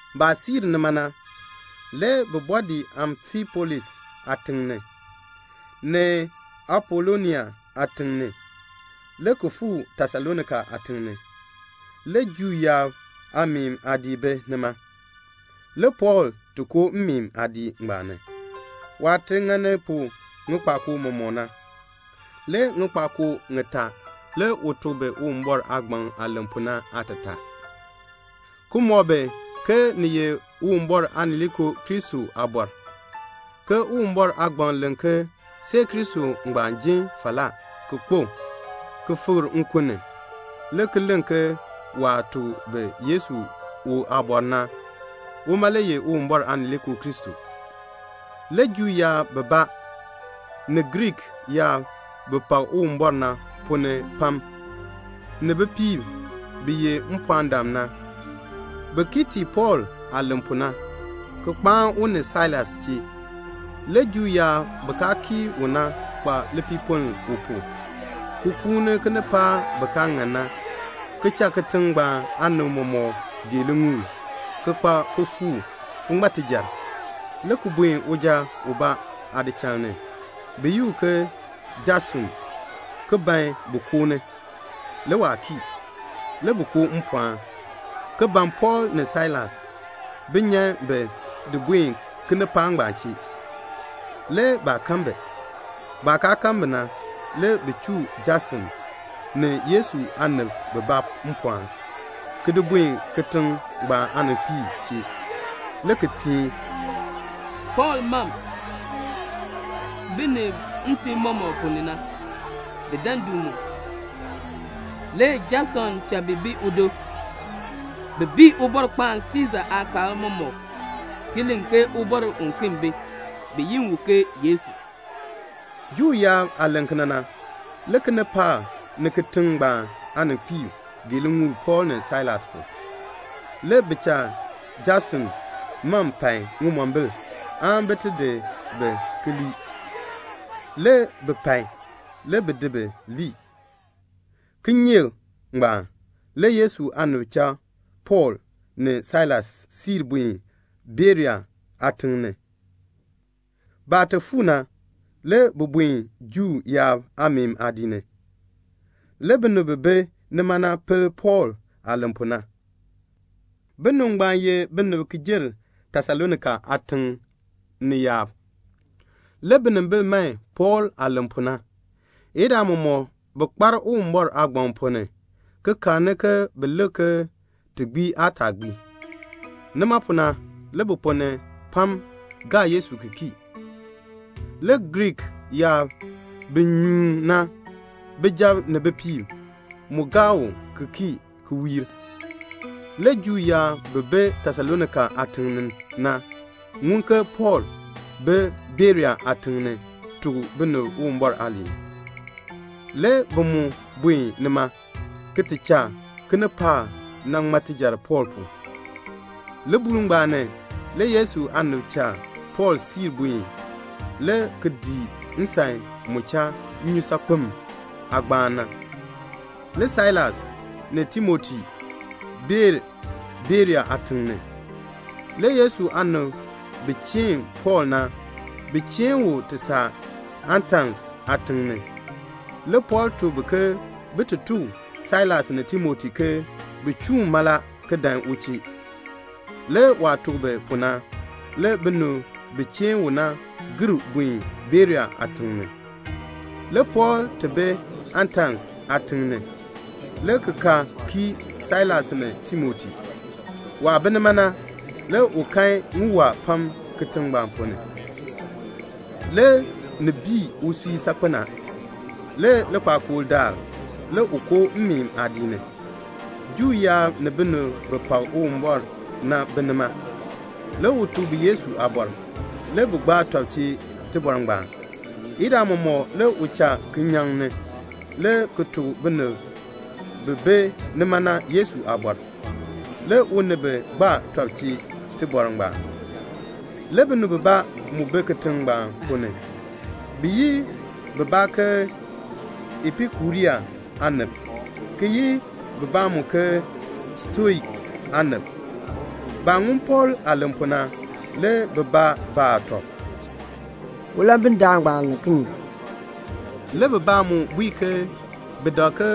Baah siir nima na, le bi bɔɔ dii Amfipolis aatiŋ ni, ni Apolonia aatiŋ ni, le ki fuu Tesalonika aatiŋ ni. Le Juu yaab aameen aadiik bi nima. Le Pɔɔl ti koo mmeen aadiik ngbaan ni, waah ti ŋani pu ŋikpakoo mɔmɔk na. Le ŋikpakoo ŋitaa le u tuk bi Uwumbɔr aagbaŋ aah len pu na aatataa, ki mɔk bi ke ni ye Uwumbɔr Aanileekoo Kristo aabɔr, ke Uwumbɔr aagbaŋ len ke see Kristo ngbaan ji falaa, ki kpo, ki fikr nkun ni, le ki len ke waah tuk bi Yesu u aabɔr na, uma le ye Uwumbɔr Aanileekoo Kristo. Le Juu yaab bibaa, ni Griik yaab bi pak Uwumbɔr na ponn ni pam, ni bipiib bi ye mpɔɔndam na, bi kii tii Pɔɔl aah len pu na, ki kpaan u ni Sailas chee. Le Juu yaab bi kaa kii u na kpa lipiipoln u pu, ki kuuni kinipaak bi kaa ŋan na, ki cha kitiŋ ngbaan aanib mɔmɔk gee liŋuul, ki kpa kifuuk, ki ŋma tijar, le ki buen uja ubaa aadichal ni, bi yi u ke Jason, ki ban bin koo ni. Le waa kii. Le bi koo mpɔɔn, ki ban Pɔɔl ni Sailas, bin nyan bi di buen kinipaak ngbaan chee. Le baa kan bi. Baah kaa kan bi na, le bi chuu Jason ni Yesu aanib bibaa mpɔɔn, ki di buen kitiŋ ngbaan aaninkpiib chee, le ki teen, "Pɔɔl mam, bi muk binib ntim mɔmɔk ponn ni na, bi dan du mu. Le Jason cha bi bi udo. Bi bii Ubɔrkpaan Siisa aakaal mɔmɔk ki len ke ubɔr uken bi, bi yi u ke Yesu." Juu yaab aah len kena na, le kinipaak ni kitiŋ ngbaan aaninkpiib gee liŋuul Pɔɔl ni Sailas pu. Le bi cha Jason mam pai ŋimombil aan bin ti di bi ki di lii. Le bi pai. Le bi di bi lii. Kinyeek ngbaan le Yesu aanib cha Pɔɔl ni Sailas siir buen Berea aatiŋ ni. Baah ti fuu na, le bi buen Juu yaab aameen aadiik ni. Le binib bi bi nima na pel Pɔɔl aah len pu na. Binib ngbaan ye binib ki jer Tesalonika aatiŋ ni yaab. Le binimbil man Pɔɔl aah len pu na. Idaa mɔmɔk bi kpar Uwumbɔr aagbaŋ ponn ni, ki karni ke bin lik ke ti gbii aan taa gbii. Nima pu na le bi ponn ni pam gaa Yesu ki kii. Le Griik yaab bi nyuun na, bijab ni bipiib, mu gaa u ki kii ki wiir. Le Juu yaab bi bi Tesalonika aatiŋ ni na ŋun ke Pɔɔl bi Berea aatiŋ ni ki tuk binib Uwumbɔr aaliin. Le bi mu buen nima ki ti cha kinipaak na ŋma tijar Pɔɔl pu. Libuul ngbaan ni, le Yesu aanib cha Pɔɔl siir buen le ki dii nsan mu cha nnyusaakpem aagbaan na. Le Sailas ni Timoti bee Berea aatiŋ ni. Le Yesu aanib bi cheen Pɔɔl na, bi cheen u ti saa Atens aatiŋ ni. Le Pɔɔl tuk bi ke bin ti tuk Sailas ni Timoti ke bin chuun mala ki dan u chee. Le waah tuk bi pu na, le binib bi cheen u na gir buen Berea aatiŋ ni. Le Pɔɔl ti bi Atens aatiŋ ni, le ki ka kii Sailas ni Timoti. Waah bi nima na, le u kan ŋiwaa pam kitiŋ ngbaan ponn ni. Le ni bii usui saakpen a. Le likpakool daal le u koo mmeen aadiik ni. Juu yaab ni binib bi pak Uwumbɔr na bi nima. Le u tuk bi Yesu aabɔr. Le bi gbaa tɔb chee tibɔr ngbaan. Idaa mɔmɔk le u cha kinyaŋ ni, le ki tuk binib bi bi nima na Yesu aabɔr. Le u ni bi gbaa tɔb chee tibɔr ngbaan. Le binib bibaa mu bi kitiŋ ngbaan ponn ni. Bi yi bibaa ke Epikurean aanib, ki yi bibaa mu ke Stoik aanib. Baah ŋun Pɔɔl aah len pu na, le bibaa baa tɔb, "Ulambidaan ngbaan len kinye?" Le bibaa mu bui ke bi dak ke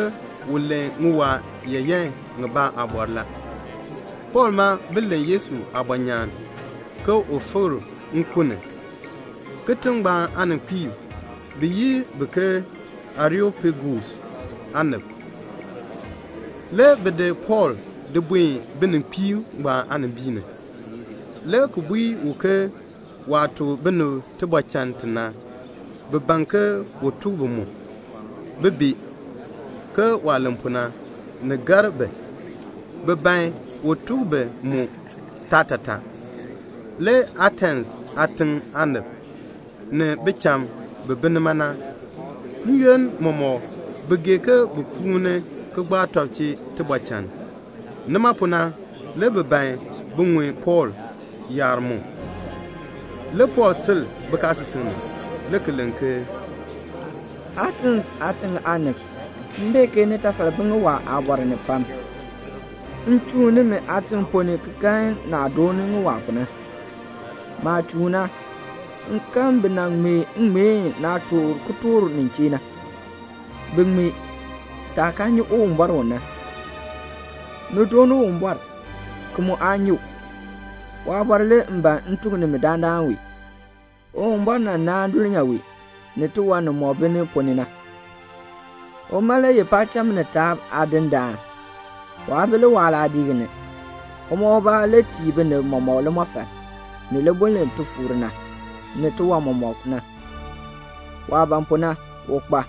u len ŋiwaa yaayan ŋibaa aabɔr la. Pɔɔl ma bi len Yesu aabɔnyaan, ke u fikr nkun ni. Kitiŋ ngbaan aaninkpiib, bi yi bi ke Areopagus aanib. Le bi di Pɔɔl di buen bininkpiib ngbaan aanimbiin ni, le ki bui u ke waah tuk binib tibɔr chann ti na, bi ban ke un tuk bi mu, bin bee, ke waah len pu na, ni gar bi, bi ban un tuk bi mu taatataa. (Le Atens aatiŋ aanib, ni bicham bi bi nima na, n-yoonn mɔmɔk bi gee ke bin kuuni ki gbaa tɔb chee tibɔr chann. Nima pu le bi ban bin ŋun Pɔɔl yaar mu.) Le Pɔɔl sil bikaasisik ni, le ki len ke "Atens aatiŋ aanib, m bee ke nitafal bi ŋiwaa aabɔr ni pam. M chuun nimi aatiŋ ponn ni ki kan naah dooni ŋiwaa pu na. Maah chuun na, m kan bi nan ŋmee ŋŋmeen naah toor kitork nin chee na. Bi ŋmee, 'Taah kaa nyi Uwumbɔr u na.' Ni dooni Uwumbɔr, ki mu aa nyi u. Waabɔr le m ban m tuk nimi dandana wee. Uwumbɔr nan naan dulnyaa wee, ni tiwan nimɔk bi ni ponn ni na. Uma le ye paacham ni taab Aadindaan. Waa bi liwaal aadiik ni. Uma ubaa le tii binib mɔmɔk limɔfal, ni libuln li ti fuur na, ni tiwan mɔmɔk na. Waah ban pu na, u kpa.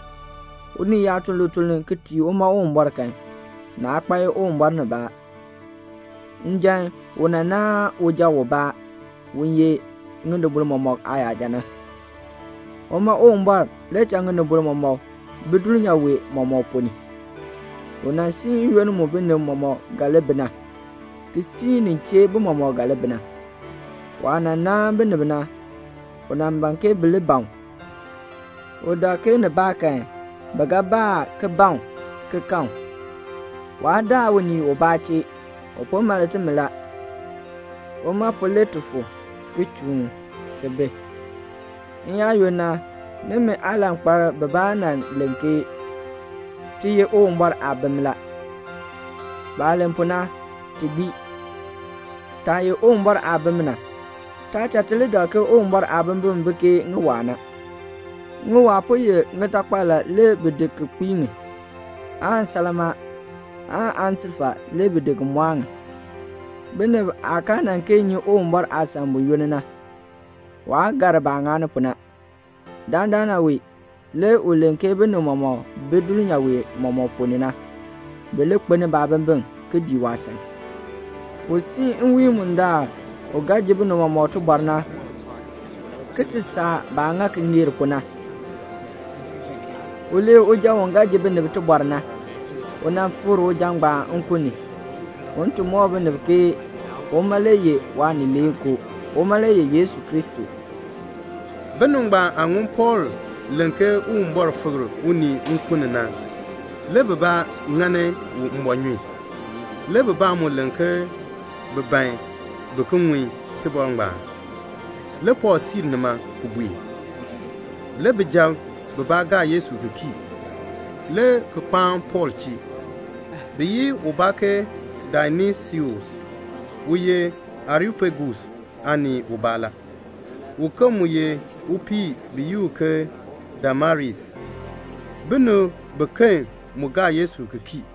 Unii yaa tun lituln ki tii uma Uwumbɔr kan, naa kpae Uwumbɔr nibaa. Njan u nan naan uja ubaa, u ye ŋinibol mɔmɔk aayaja na. Uma Uwumbɔr le cha ŋinibol mɔmɔk bi dulnyaa wee mɔmɔk ponn ni. U nan siin n-yoonn mu binib mɔmɔk ga li bi na, ki siin nin chee bi mɔmɔk ga li bi na. Waah nan naan binib na, u ban ke bi li ban u. U dak ke nibaakan bi ga baa ki ban u ki kan u. Waa daa unii ubaa chee. U po mal timi la. Uma pu le ti fu, ki chuun, ki bi. N-yaayoonn na, nimi aalankpalb bibaa nan len ke 'Ti ye Uwumbɔr aabim la.' Baah len pu na, ti gbii. Taah ye Uwumbɔr aabim na, taa cha ti li dak ke Uwumbɔr aabimbin bi ke ŋiwaa na. Ŋiwaa po ye ŋitakpal la, le bi di ki kpii ŋi; aan salmaa, aan aansilfa le bi di ki mɔɔ ŋi. Binib aah kaa nan kee nyi Uwumbɔr aasan buyoonn na, waa gar baah ŋani pu na. Dandana wee le u len ke binib bimɔk bi dulnyaa wee mɔmɔk ponn ni na, bi li kpeln baabimbin ki dii waasan. U siin nwiin bundaln u ga ji binib mɔmɔk tibɔr na, ki ti saa baah ŋa ki ŋeer pu na. U lee uja u ga ji binib tibɔr na. U nan fikr uja ngbaan nkun ni, un ti mɔk binib ke uma le ye Waanileekoo. Uma le ye Yesu Kristo." Binib ngbaan aah ŋun Pɔɔl len ke Uwumbɔr fikr unii nkun ni na, le bibaa ŋani u mbɔɔnyun. Le bibaa mu len ke bi ban bi ki ŋun tibɔr ngbaan. Le Pɔɔl siir nima ki buen. Le bijab bibaa gaa Yesu ki kii, le ki kpaan Pɔɔl chee. Bi yi ubaa ke Dionisius u ye Areopagus aanii ubaa la. Uken mu ye upii bi yi u ke Damaris. Binib biken mu gaa Yesu ki kii.